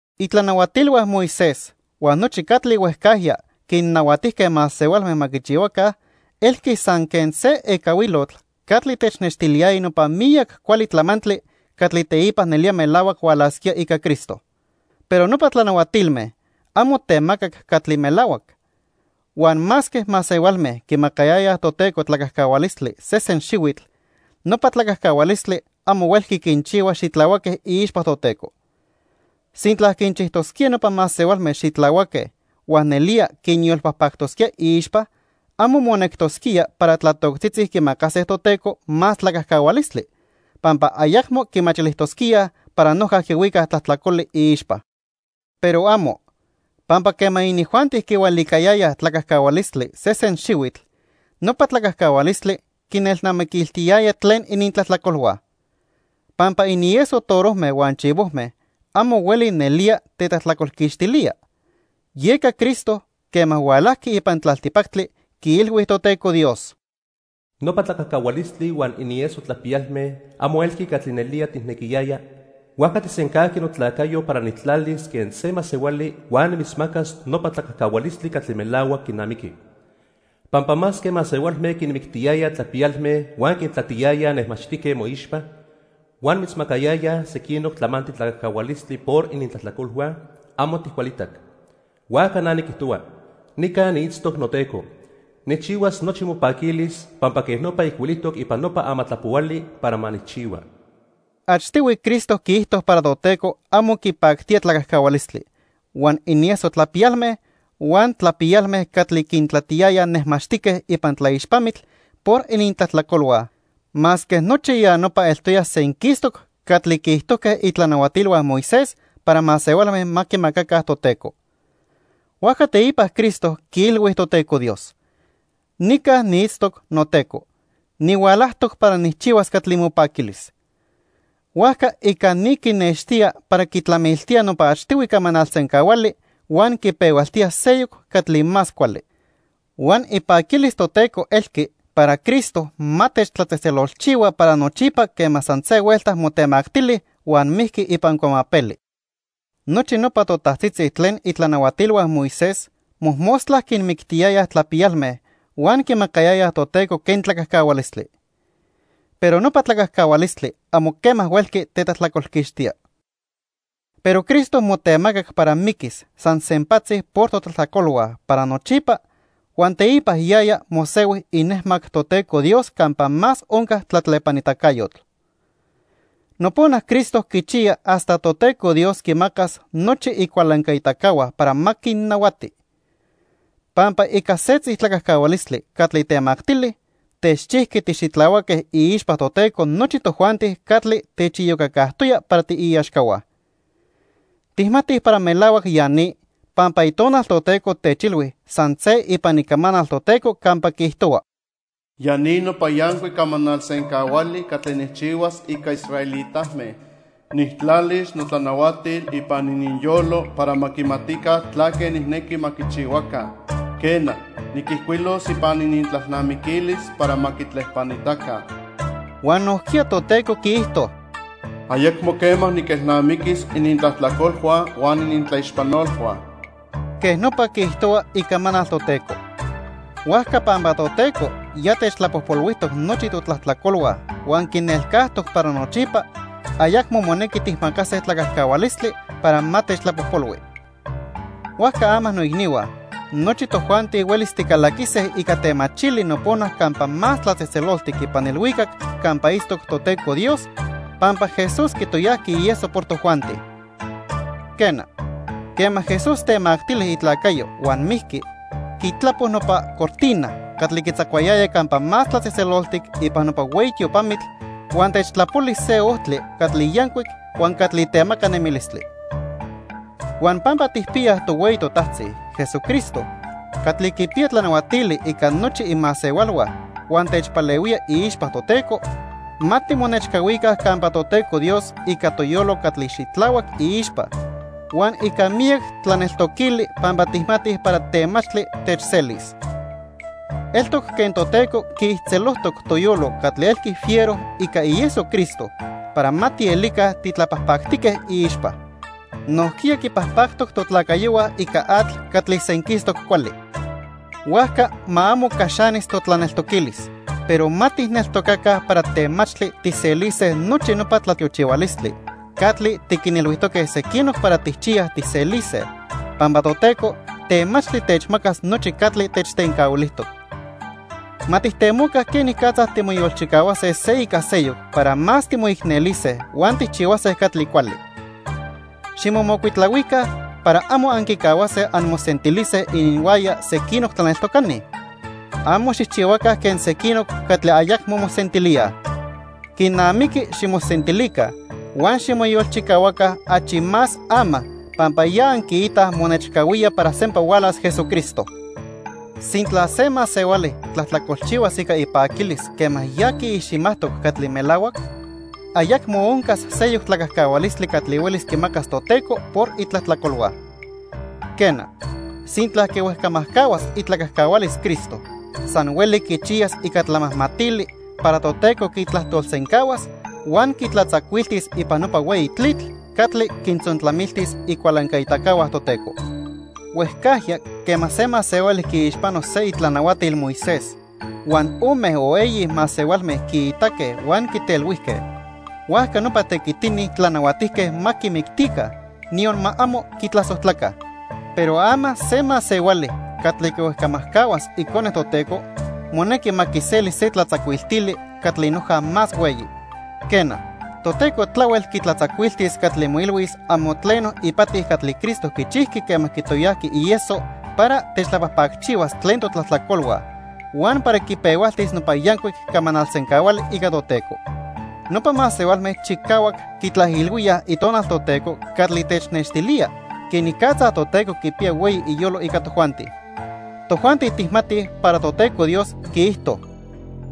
Itlanahuatilhua Moisés huan nochi catli huejcajya quinnahuatijque masehualme ma quichihuaca elqui san quen se ecahuilotl catli technextiliyaya nopa miyac cuali tlamantli catli teipa nelía melahuac hualasquía ica Cristo. Pero nopa tlanahuatilme amo temacac catli melahuac. Huan masque masehualme quimacayayaj Toteco tlacajcahualistli sesen xihuitl, nopa tlacajcahualistli amo huelqui quinchihua xitlahuaque iixpa Toteco. Sintla quinchijtosquía nopa masehualme xitlahuaque huan nelía quinyolpajpactosquía iixpa, amo monectosquía para tlatoctzitzi quimacase Toteco más tlacajcahualistli, pampa ayacmo quimachilijtosquíaj para noja quihuicaj tlajtlacoli iixpa. ¡Pero amo! Pampa quema inijuanti quihualicayayaj tlacajcahualistli sesen xihuitl, nopa tlacajcahualistli quinelnamiquiltiyaya tlen inintlajtlacolhua. Pampa inieso torojme huan chivojme amo hueli nelía tetlajtlacolquixtilía. Yeca Cristo, quema hualajqui ipan tlaltipactli, quiilhui Toteco Dios: "Nopa tlacajcahualistli huan inieso tlapiyalme amo elqui catli nelía tijnequiyaya, huajca tijsencajqui notlacayo para nitlacatis quen se masehuali huan nimitzmacas nopa tlacajcahualistli catli melahuac quinamiqui. Pampa masque masehualme quinmictiyayaj tlapiyalme huan quintlatiyayaj nejmaxtique moixpa, huan mitzmacayayaj sequinoc tlamantli tlacajcahualistli por inintlajtlacolhua, amo tijcualitac. Huajca na niquijtohua: 'Nica niitztoc noTeco. Nijchihuas nochi mopaquilis pampa quej nopa ijcuilijtoc ipan nopa Amatlapohuali para ma nijchihua.' " Achtihui Cristo quiijto para Toteco amo quipactía tlacajcahualistli, huan inieso tlapiyalme, huan tlapiyalme catli quintlatiyayaj nejmaxtique ipan tlaixpamitl por inintlajtlacolhua masque nochi ya nopa eltoya senquistoc catli quiijtojque itlanahuatilhua Moisés para masehualme ma quimacaca Toteco. Huajca teipa Cristo quiilhui Toteco Dios: "Nica niitztoc noTeco. Nihualajtoc para nijchihuas catli mopaquilis." Huajca ica ni quinextía para quitlamiltía nopa achtihui camanal sencahuali huan quipehualtía seyoc catli más cuali. Huan ipaquilis Toteco elqui para Cristo ma techtlatzejtzelolchihua para nochipa quema san se huelta motemactili huan mijqui ipan cuamapeli. Nochi nopa totajtzitzi tlen itlanahuatilhua Moisés mojmostla quinmictiyayaj tlapiyalme huan quimacayayaj Toteco quen tlacajcahualistli. Pero nopa tlacajcahualistli amo quema huelqui tetlajtlacolquixtía. Pero Cristo motemacac para miquis san sempatzi por totlajtlacolhua para nochipa, huan teipa yaya mosehui inejmac Toteco Dios campa más onca tlatlepanitacayotl. Nopona Cristo quichiya hasta Toteco Dios quimacas nochi icualancaitacahua para ma quinnahuati. Pampa ica setzi tlacajcahualistli catli temactili, techchijqui tixitlahuaque iixpa Toteco nochi tojuanti catli techiyocacajtoya para tiiaxcahua. Tijmatij para melahuac ya ni, pampa Itonal Toteco techilhui san se ipan Icamanal Toteco campa quiijtohua: "Ya ni nopa yancuic camanal sencahuali catli nijchihuas ica israelitame. Nijtlalis notlanahuatil ipan ininyolo para ma quimatica tlaque nijnequi ma quichihuaca, Quena, niquijcuilos ipan inintlalnamiquilis para ma quitlepanitaca." Huan nojquiya Toteco quiijto: "Ayacmo quema niquelnamiquis inintlajtlacolhua huan inintlaixpanolhua." Quej nopa quiijtohua Icamanal Toteco. Huajca pampa Toteco ya techtlapojpolhuijtoc nochi totlajtlacolhua huan quinelcajtoc para nochipa, ayacmo monequi tijmacase tlacajcahualistli para ma techtlapojpolhui. Huajca ama noicnihua, nochi tojuanti huelis ticalaquise ica temachili nopona Campa Más Tlatzejtzeloltic ipan ilhuicac campa itztoc Toteco Dios, pampa Jesús quitoyajqui ieso por tojuanti. Quena, quema Jesús temactili itlacayo huan mijqui, quitlapo nopa cortina catli quitzacuayaya Campa Más Tlatzejtzeloltic ipan nopa hueyi tiopamitl huan techtlapoli se ojtli catli yancuic huan catli temaca nemilistli. Huan pampa tijpiyaj tohueyi totajtzi, Jesucristo, catli quipiya tlanahuatili ica nochi imasehualhua huan techpalehuía iixpa Toteco, ma timonechcahuica campa Toteco Dios ica toyolo catli xitlahuac iixpa huan ica miyac tlaneltoquili pampa tijmatij para temachtli techselis. Eltoc quen Toteco quiijtzelojtoc toyolo catli elqui fiero ica ieso Cristo para ma tielica titlapajpactique iixpa. Nojquiya quipajpactoc totlacayohua ica atl catli senquistoc cuali. Huajca ma amo caxanis totlaneltoquilis, pero ma tijneltocaca para temachtli tijselise nochi nopa tlatiochihualistli catli tiquinilhuijtoque sequinoc para tijchiyaj tijselise, pampa Toteco temachtli techmacas nochi catli techtencahuilijtoc. Ma tijtemoca quenicatza timoyolchicahuase se ica seyoc para más timoicnelise huan tijchihuase catli cuali. Ximomocuitlahuica para amo anquicahuase anmosentilise ininhuaya sequinoc tlaneltocani. Amo xijchihuaca quen sequinoc catli ayacmo mosentilíaj. Quinamiqui ximosentilica huan ximoyolchicahuaca achi más ama pampa ya anquiitaj monechcahuía para sempa hualas Jesucristo. Sintla se masehuali tlajtlacolchihuas ica ipaquilis quema ya quiiximajtoc catli melahuac, ayacmo oncas seyoc tlacajcahualistli catli huelis quimacas Toteco por itlajtlacolhua. Quena, sintla quihuejcamajcahuas itlacajcahualis Cristo, san hueli quichiyas ica tlamajmatili para Toteco quitlajtolsencahuas huan quitlatzacuiltis ipan nopa hueyi tlitl catli quintzontlamiltis icualancaitacahua Toteco. Huejcajya quema se masehuali quiixpano se itlanahuatil Moisés huan ome o eyi masehualme quiitaque huan quitelhuijque, huajca nopa tequitini tlanahuatijque ma quimictica, niyon ma amo quitlasojtlaca. Pero ama se masehuali catli quihuejcamajcahuas Icone Toteco, monequi ma quiseli se tlatzacuiltili catli noja más hueyi. Quena, Toteco tlahuel quitlatzacuiltis catli moilhuis amo tleno ipati catli Cristo quichijqui quema quitoyajqui ieso para techtlapajpacchihuas tlen totlajtlacolhua huan para quipehualtis nopa yancuic camanal sencahuali ica Toteco. Nopa masehualme chicahuac quitlaijilhuíaj Itonal Toteco catli technextilía quenicatza Toteco quipiya hueyi iyolo ica tojuanti. Tojuanti tijmatij para Toteco Dios quiijto: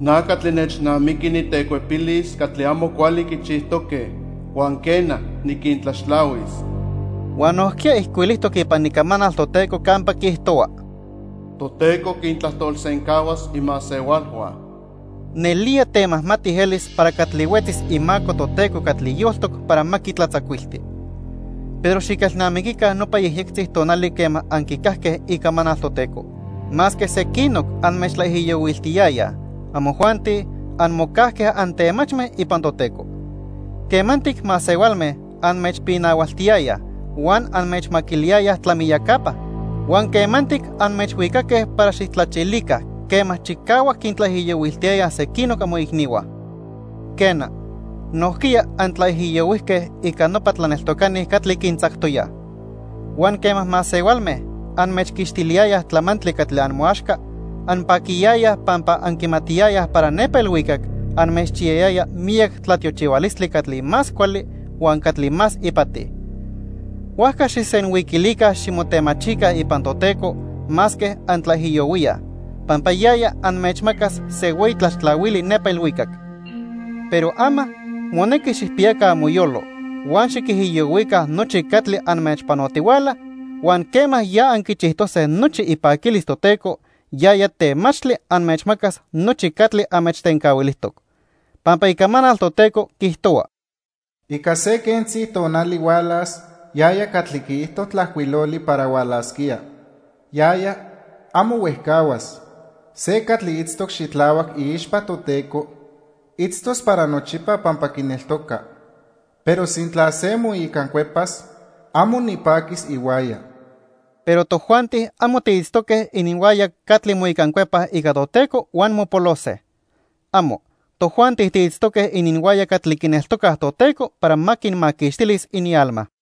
"Na catli nechnamiqui nitecuepilis catli amo cuali quichijtoque huan quena, niquintlaxtlahuis." Huan nojquiya ijcuilijtoc ipan Icamanal Toteco campa quiijtohua: "Toteco quintlajtolsencahuas imasehualhua." ¡Nelía temajmati elis para catli huetzis imaco Toteco catli yoltoc para ma quitlatzacuilti! Pero xiquelnamiquica nopa yejyectzi tonali quema anquicajque icamanal Toteco. Masque sequinoc anmechtlaijiyohuiltiyayaj, amojuanti anmocajque antemachme ipan Toteco. Quemantic masehualme anmechpinahualtiyayaj huan anmechmaquiliyayaj tlamiyacapa. Huan quemantic anmechhuicaque para xijtlachilica quema chicahuac quintlaijiyohuiltiyayaj sequinoc amoicnihua. Quena, nojquiya antlaijiyohuijque ica nopa tlaneltocani catli quintzactoyaj. Huan quema masehualme anmechquixtiliyayaj tlamantli catli amoaxca, anpaquiyayaj pampa anquimatiyayaj para nepa ilhuicac anmechchiyayaya miyac tlatiochihualistli catli más cuali huan catli más ipati. Huajca xijsenhuiquilica ximotemachica ipan Toteco masque antlaijiyohuíaj, pampa yaya anmechmacas se hueyi tlaxtlahuili nepa ilhuicac. Pero ama, monequi xijpiyaca amoyolo huan xiquijiyohuica nochi catli anmechpanotihuala, huan quema ya anquichijtose nochi ipaquilis Toteco, yaya temachtli anmechmacas nochi catli anmechtencahuilijtoc. Pampa Icamanal Toteco quiijtohua: "Ica se quentzi tonali hualas yaya catli quiijto tlajcuiloli para hualasquía. Yaya, amo huejcahuas. Se catli itztoc xitlahuac iixpa Toteco, itztos para nochipa pampa quineltoca. Pero sintla se moicancuepas, amo nipaquis ihuaya." Pero tojuanti amo tiitztoque ininhuaya catli moicancuepaj ica Toteco huan mopolose. ¡Amo! Tojuanti tiitztoque ininhuaya catli quineltocaj Toteco para ma quinmaquixtilis inialma.